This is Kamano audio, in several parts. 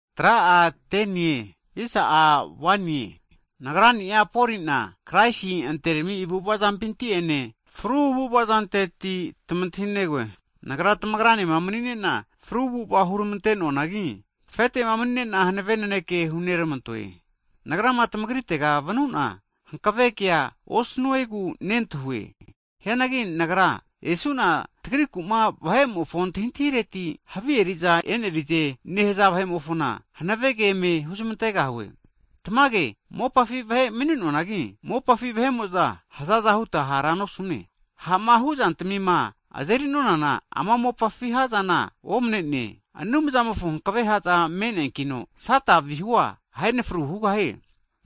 Hagi nagrani'a Poli'na, Kraisi anterami avu'avazampinti'ene fru avu'avazanteti tamantahinegoe. Nagra tamagranema mani'nena fru avu'ava huramante'noanagi, afete'ma mani'nena hanave naneke huneramantoe. Nagrama tamagritega vanu'na hankave kea osnuegu nentahue. Hianagi nagra esu'na tagriku'ma vahe'mofo antahintireti havi eri'za e'nerize nehaza vahe'mofona hanavege eme huzmantegahue. Tamage mopafi vahe mani'nonanagi, mopafi vahe'mo'za hzaza huta hara nosune. Ha'ma huzantamima azeri'nonana, ama mopafi ha'zana omne'ne. Anumzamofo hankave ha'za me'neankino, Sata vihua ahe'nafru hugahie.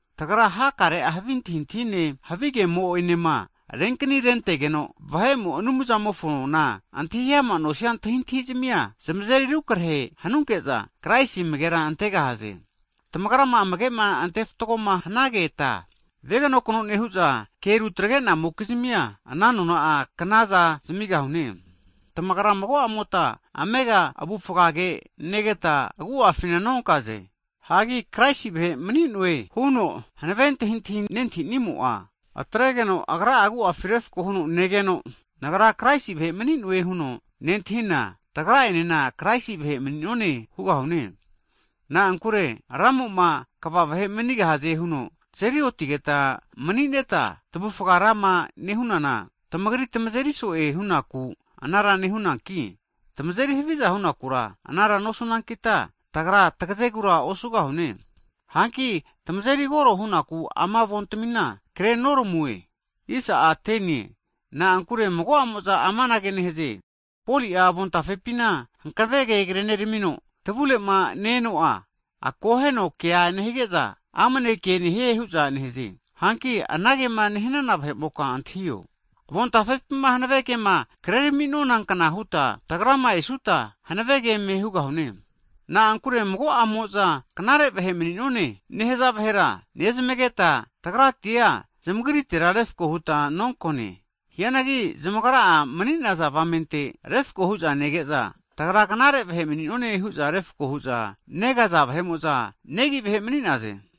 Tagra hakare'a havi antahintahine havigemo'enema renkani renentegeno vahe'mo'ma Anumzamofoma antahi ama nosia antahintahizmia, zamazeri rukrehe hanunke'za Kraisi amagera nentaze. Tamagrama amage'ma ante fatgoma hanageta, veganokno nehu'za, ke rutrage'namokizmia, ana nona'a knaza zamigahune. Tamagra mago'amota amega avufgage negeta agu'afina nonkaze. Hagi Kraisi vahe mani'noe huno hanave antahintahi nentahinimo'a, atregeno agra'a agu'afi refko huno negeno, nagra Kraisi vahe mani'noe huno nentahina, tagra'enena Kraisi vahe mani'none hugahune. Na'ankure Ramo'ma kva vahe manigahaze huno tazeri otigeta mani'neta tavufga rama nehunana, tamagri tamazeri so'e hunaku anara nehunanki, tamazeri haviza hunakura anara nosunankita, tagra tagazegura osugahune. Hanki tamazeri koro hunaku ama avontamina krenoramue. Na'ankure mago'amo'za amanage nehaze, Poli'a avontafepina hankave ke kreneramino, tavure'ma ne-eno'a, akoheno kea nehige'za, amnege nehie hu'za nehaze. Hanki anagema nehanana vahe'moka antahio. Tagranema omanineta avontafe'tamimpima hankave kema krerami'nonankna huta tagrama esuta, hankavege eme hugahune. Na'ankure mago'amo'za knare vahe mani'none nehaza vahera nezmageta, tagratia zamagritera refko huta nonkone. Hianagi zamagra'a mani'naza avamente refko hu'za nege'za, tagra knare vahe mani'none hu'za refko hu'za negaza vahe'mo'za, negi vahe mani'naze.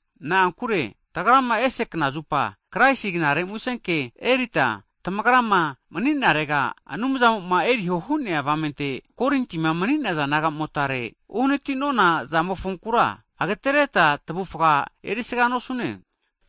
Na'ankure tagrama ese knazupa Kraisi Knare Musenke, Anumzamo'ma eriho hu'nea avamente Korintima mani'naza nagamotare erita uhaniti'nona zamofonkura, agatereta tavufga erisaga nosune.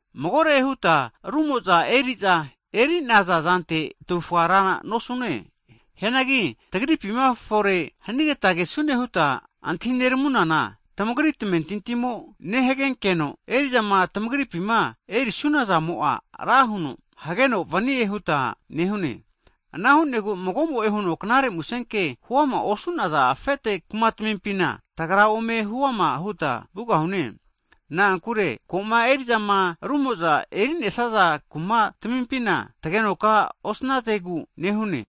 Magore huta rumo'za eri'za eri'naza zantera tavufga rana osu'none. Hianagi tagripi'ma fore hanigeta kesune huta antahi neramunana, tamagri tamentintimo nehagenkeno, eri'zama tamagripima erisuna zamo'a ra huno hageno vanie huta nehune. Ana hu'negu, mago'mo'e huno Knare Musenke huama osu'naza afete kumatamimpina, tagra ome huama huta vugahune. Na'ankure koma eri'zama rumo'za e'rinesaza kumatamimpina ome e'nerisunkeno tagenoka osnazegu nehune.